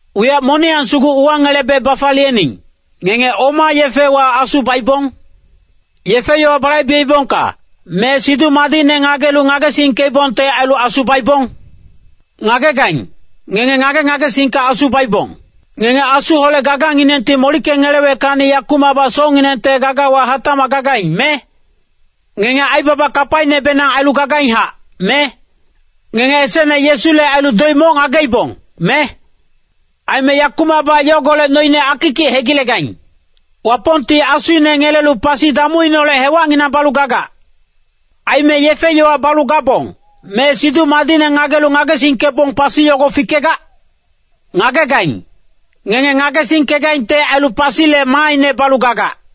Wiyac moniyang sugu uwangelebe bafaliyening, ngenge oma yefewa Asu baibong? Yefe-yowa balaibeibongka, me Siduc Madicne ngagelu ngagesingkeibongte ailu Asu baibong? Ngagegaing, ngenge ngage-ngagesingka Asu baibong. Ngenge Asuholec gaganginengti molickeweckacni yakumacbac socnginengte gagawa hatacmac gagaing, me? Ngenge aibaba kapainebenang ailu gagainghac, me? Ngenge esecne Yesule ailu doic moc ngageibong, me? Aime yakumacbac yogolec noine akikic hegilegaing. Wapongti Asuine ngelelu pasi damuineholec hewacnginang balu gagac. Aime yefe-yowa balu gabong, me Siduc Madicne ngagelu ngagesingkebong pasi yogo fikegac? Ngagegaing, ngenge ngagesingkegaingte ailu pasile maaine balu gagac.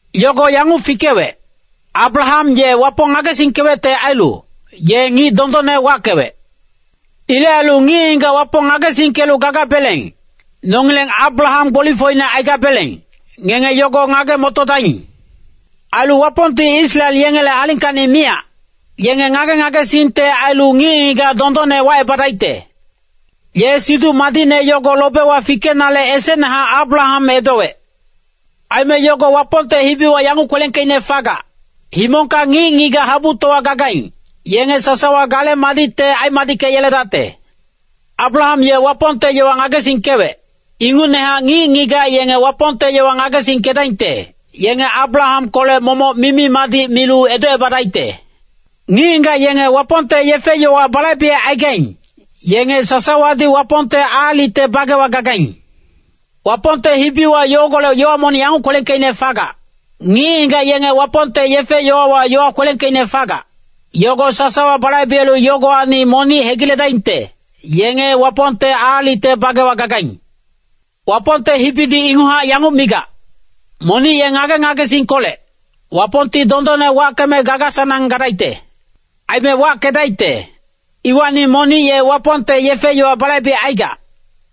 Yogo yanguc fikewec, “Abraham ye Wapong ngagesingkewecte ailu, ye ngic dondonne wackewec.” Ilec ailu ngic-ngigac Wapong ngagesingkelu gagabeleng, nongileng Abraham gbolifocine aigabeleng, ngenge yogo ngage-motodaing. Ailu Wapongti Israel yengele alingkacni miyac, yenge ngage-ngagesingte ailu ngic-ngigac dondonne wacebadaicte. Ye Siduc Madicne yogo lobewa fikenale esecnehac Abraham edowec. Aime yogo Wapongte hibiwa yanguc kwelengkeicne fagac, “Himongka ngic-ngigac habutowa gagaing, yenge sasawa gale madicte aimadickeyeledacte.” Abraham ye Wapongte yowa ngagesingkewec, ingucnehac ngic-ngigac yenge Wapongte yowa ngagesingkedaingte, yenge Abrahamkolec momoc mimi-madic milu edocebadaicte. Ngic-ngigac yenge Wapongte yefe-yowa balaibecaigaing, yenge sasawadi Wapongte aalicte bagewa gagaing. Wapongte hibiwa yogolec yowa monic yanguc kwelengkeicne fagac, “Ngic-ngigac yenge Wapongte yefe-yowawa yowa kwelengkeicne fagac, yogo sasawa balaibelu yogowacni monic hegiledaingte, yenge Wapongte aalicte bagewa gagaing.” Wapongte hibidi inguchac yanguc migac, “Monic ye ngage-ngagesingkolec, Wapongti dondonne wackeme gaga-sanang gadaicte.” Aime wackedaicte, iwacni monic ye Wapongte yefe-yowa balaibecaigac,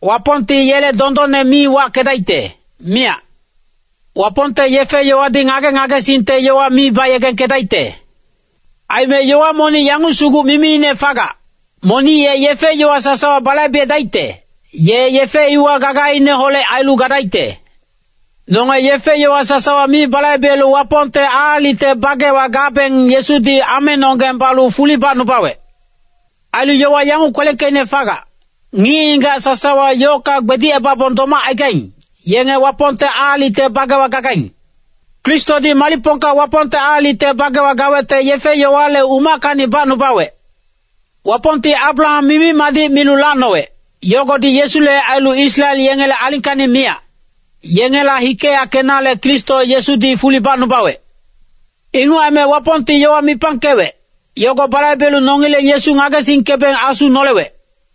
Wapongti yele dondonne mi wackedaicte, miyac. Wapongte yefe-yowadi ngage-ngagesingte yowa mi bayegengkedaicte. Aime yowa monic yanguc sugu mimiine fagac, “Monic ye yefe-yowa sasawa balaibedaicte, ye yefe iwa gagaineholec ailu gadaicte.” Nonge yefe-yowa sasawa mi balaibelu Wapongte aalicte bagewa gabeng Yesudi amenonggeng balu fuli bacnubawec. Ailu yowa yanguc kwelengkeicne fagac, “Ngic-ngigac sasawa yocka gbedicebabong domacaigaing, yenge Wapongte aalicte bagewa gagaing.” Kristodi malicpongka Wapongte aalicte bagewa gawecte yefe-yowale umackacni bacnubawec. Wapongti Abraham mimi-madic milu lacnowec, yogodi Yesule ailu Israel yengele alingkacni miyac, yengela hikeyackenale Kristo Yesudi fuli bacnubawec. Inguc aime Wapongti yowa mipangkewec, yogo balaibelu nongileng Yesu ngagesingkebeng Asu nolewec.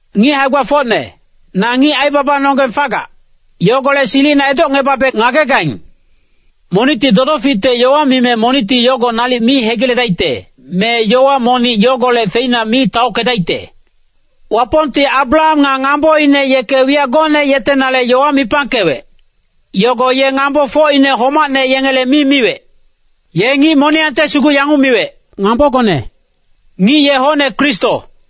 Ngic hae-gbafocne, na ngic aibabanonggeng fagac, yogolec silicina edocngebabe ngagegaing. Monicti dodoficte yowa mime monicti yogo nalic mi hegiledaicte, me yowa monic yogolec feina mi taockedaicte. Wapongti Abraham nga ngamboine yeke wiyac gocne yetenale yowa mipangkewec, yogo ye ngambofocine homacne yengele mi miwec. Ye ngic moniyangte sugu yanguc miwec, “Ngambogone.” Ngic ye hocne Kristo.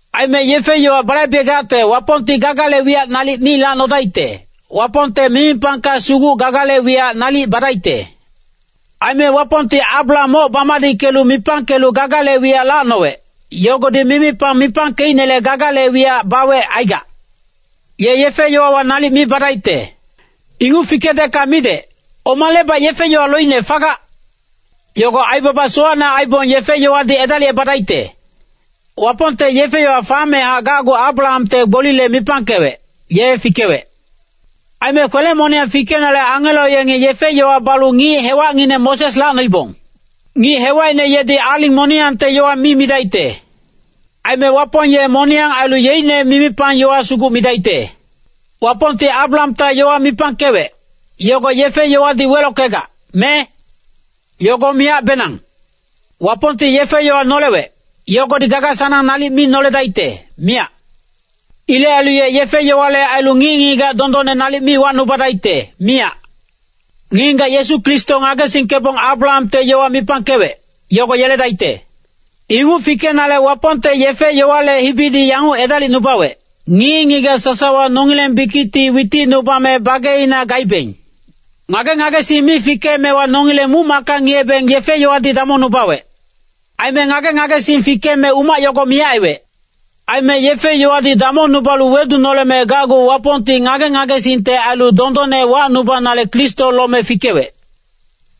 Aime yefe-yowa balaibegacte Wapongti gagale wiyac nalic mi lacnodaicte, Wapongte mimipangka sugu gagale wiyac nalic badaicte. Aime Wapongti Abraham moc bamadickelu mipangkelu gagale wiyac lacnowec, yogodi mimipang mipangkeicnele gagale wiyac bawec aigac. Ye yefe-yowawa nalic mi badaicte. Inguc fikedecka midec, omalebac yefe-yowa loicne fagac? Yogo aibaba sowacne aibong yefe-yowadi edalicebadaicte. Wapongte yefe-yowa famehac gacgu Abrahamte gbolile mipangkewec, ye fikewec. Aime kwele-moniyang fikenale angelo yengi yefe-yowa balu ngic hewacngineng Moses lacnoibong. Ngic hewacine yedi aling moniyangte yowa mi midaicte. Aime Wapong ye moniyang ailu yeicne mimipang yowa sugu midaicte. Wapongti Abrahamta yowa mipangkewec, yogo yefe-yowadi welockegac, me? Yogo miyacbenang. Wapongti yefe-yowa nolewec, yogodi gaga-sanang nalic mi noledaicte, miyac. Ilec ailu ye yefe-yowale ailu ngic-ngigac dondonne nalic mi wacnubadaicte, miyac. Ngic-ngigac Yesu Kristo ngagesingkebong Abrahamte yowa mipangkewec, yogo yeledaicte. Inguc fikenale Wapongte yefe-yowale hibidi yanguc edalicnubawec, ngic-ngigac sasawa nongileng bikicti witicnubame bageina gaibeng. Ngage-ngagesing mi fikeemewa nongileng muc-macka ngiyebeng yefe-yowadi damongnubawec. Aime ngage-ngagesing fikeme umac yogo miyac aiwec. Aime yefe-yowadi damongnubalu wedunoleme gacgu Wapongti ngage-ngagesingte ailu dondonne wacnubanale Kristo lome fikewec.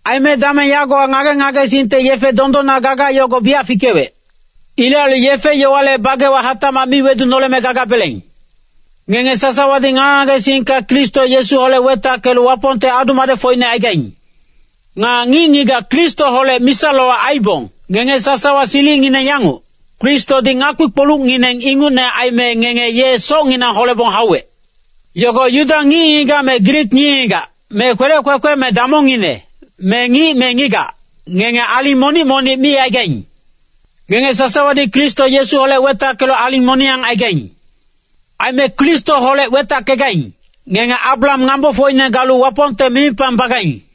Aime dameng yagowa ngage-ngagesingte yefe dondonna gaga yogo biyac fikewec. Ilec ailu yefe-yowale bagewa hatacmac mi wedunoleme gagabeleng. Ngenge sasawadi ngage-ngagesingka Kristo Yesuholec wetackelu Wapongte adu-madecfocine aigaing. Nga ngic-ngigac Kristoholec misa-lowac aiibong, ngenge sasawa silicngineng yanguc, Kristodi ngakpi-kpolucngineng ingucne aime ngenge ye socnginang holebong hauwec. Yogo Yuda ngic-ngigac me Grik ngic-ngigac, me kwelec kwekwe me damongngine, me ngic me ngigac, ngenge aling monic-monic mi aigaing. Ngenge sasawadi Kristo Yesuholec wetackelu aling moniyang aigaing. Aime Kristoholec wetackegaing, ngenge Abraham ngambofocine galu Wapongte mimipang bagaing.